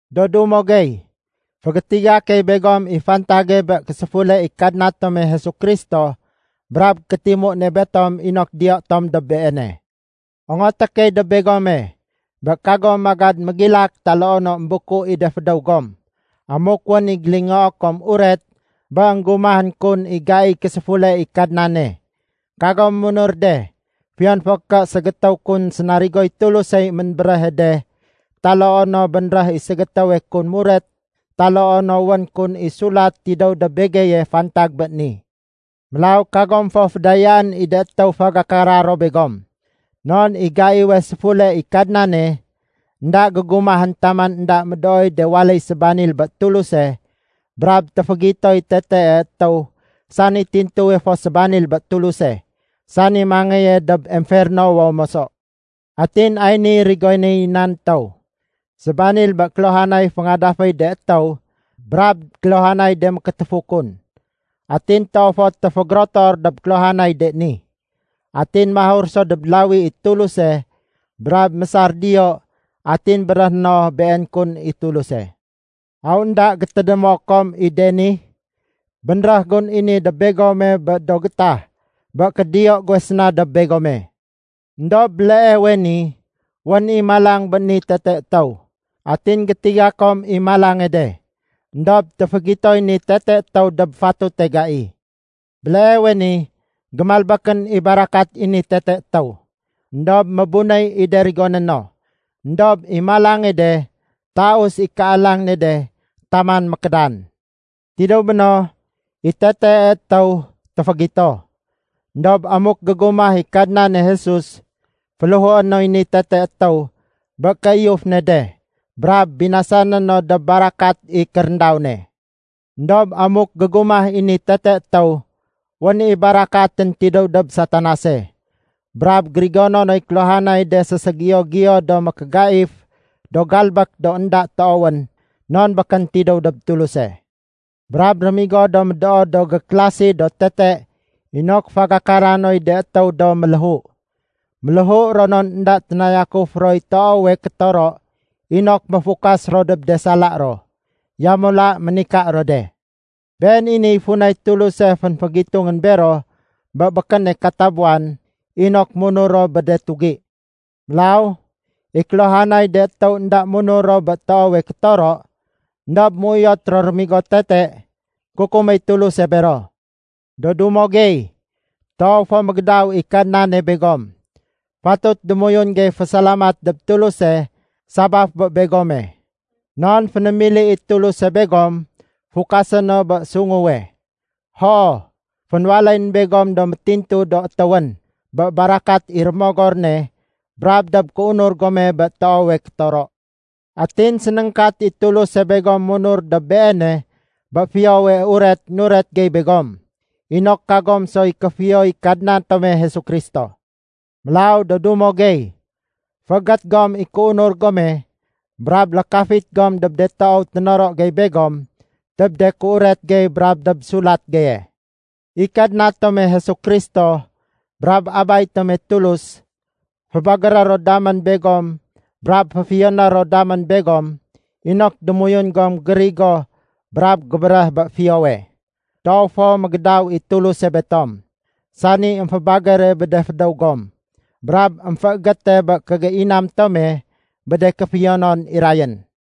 Do dumo gey, fégétiga key begom i fantage bé késéfule i Kadna tome Jesu Kristo brab kétimu ne betom inok diyo tom dob Beene. Ongoté key dob begome, bé kagom magad mégilak taloo no émbuku i de fédéw gom amuk wén i gélingoo kom uret bé énggumahén kun i gaiy késéfule i Kadnane. Kagom munur de fiyon fo ké ségétéw kun sénarigoy Tulusey ménbéréhe de taloo no bénréh i ségétéwe kun muret taloo no wén kun i sulat tidéw dob begeye fantag bé ni. Mélaw kagom fo fédayaén i de étéw fagakara ro begom. Non i gaiwe séfule i Kadnane, énda gégumahén taman énda médooy de waléy sébanil bé Tuluse brab téfégitoy Tetee Etéw sani tintuwe fo sébanil bé Tuluse, sani mangéye dob emfernowo moso. Atin ay niy rigonéy nan étéw: Sébanil bé kéluhanay féngadaféy de étéw brab kéluhanay de mékétéfu kun. Atin toow fo téfégérotor dob kéluhanay de ni. Atin mahur so dob lawi i Tuluse brab mésar diyo atin béréhé no been kun i Tuluse. Aw énda gétédémo kom i de ni? Bénréh gun i ni dob begome bé do gétah bé kédiyo guwe séna dob begome. Endob béleewe ni wén i malang bé ni Tete Etéw, atin gétiga kom i malange de. Endob téfégitoy ni Tete Etéw dob fatute gai. Béleewe ni, gémalbékén i barakat i ni Tete Etéw, éndob mébunéy i de rigoné no. Endob i malange de, taus i kéalang ne de taman mékédan. Tidéw béno, i Tetee Etéw téfégito. Endob amuk gégumah i Kadnane Jesus, féléhué noy ni Tete Etéw bé kéiyuf ne de brab binasané no dob barakat i kéréndaw ne. Endob amuk gégumah i ni Tete Etéw, wén i barakatén tidéw dob Satanase. Brab gérigono noy kéluhanay de séségiyo-giyo do mékégaif do galbék do énda toowén non békén tidéw dob Tuluse. Brab rémigo do médoo do gékélasi do tete inok fagakara noy de étéw do méléhu. Méléhu ro non énda ténayakuf roy toowe kétoro inok méfukas ro dob de sala ro. Yamula ménika ro de. Been i niy funay Tuluse fénfégitungén bero bé békéne katabuwan inok munur ro bé de tugi. Mélaw i kéluhanay de étéw énda munur ro bé toowe kétoro éndob méuyot ro rémigo tete, kukuméy Tuluse bero. Do dumo gey, toow fo mégédaw i Kadnane begom. Fatut démoyun gey fésalamat dob Tuluse sabaf bé begom. Non fénémili i Tuluse begom fukasé no bé sunguwe. Hoo, fénwaléyén begom do métintu do étéwén bé barakat i Rémogor ne brab dob kéunur gome bé toowe kétoro. Atin sénéngkat i Tuluse begom munur dob Beene bé Fiyowe Uret nuret gey begom, inok kagom soy kéfiyoy Kadna tome Jesu Kristo. Mélaw do dumo gey, féégét gom i kéunur gome brab lékafit gom dob de toow ténoro gey begom dob de kéuret gey brab dob sulat geye. I Kadna tome Jesu Kristo brab Abay tome Tulus fébagéré ro damén begom brab féfiyoné ro damén begom inok démoyun gom gérigo brab gébéréh bé fiyowe. Toow fo mégédaw i Tuluse betom, sani émfébagére bé de fédéw gom brab émféégéte bé kégéinam tome bé de kéfiyonon irayén.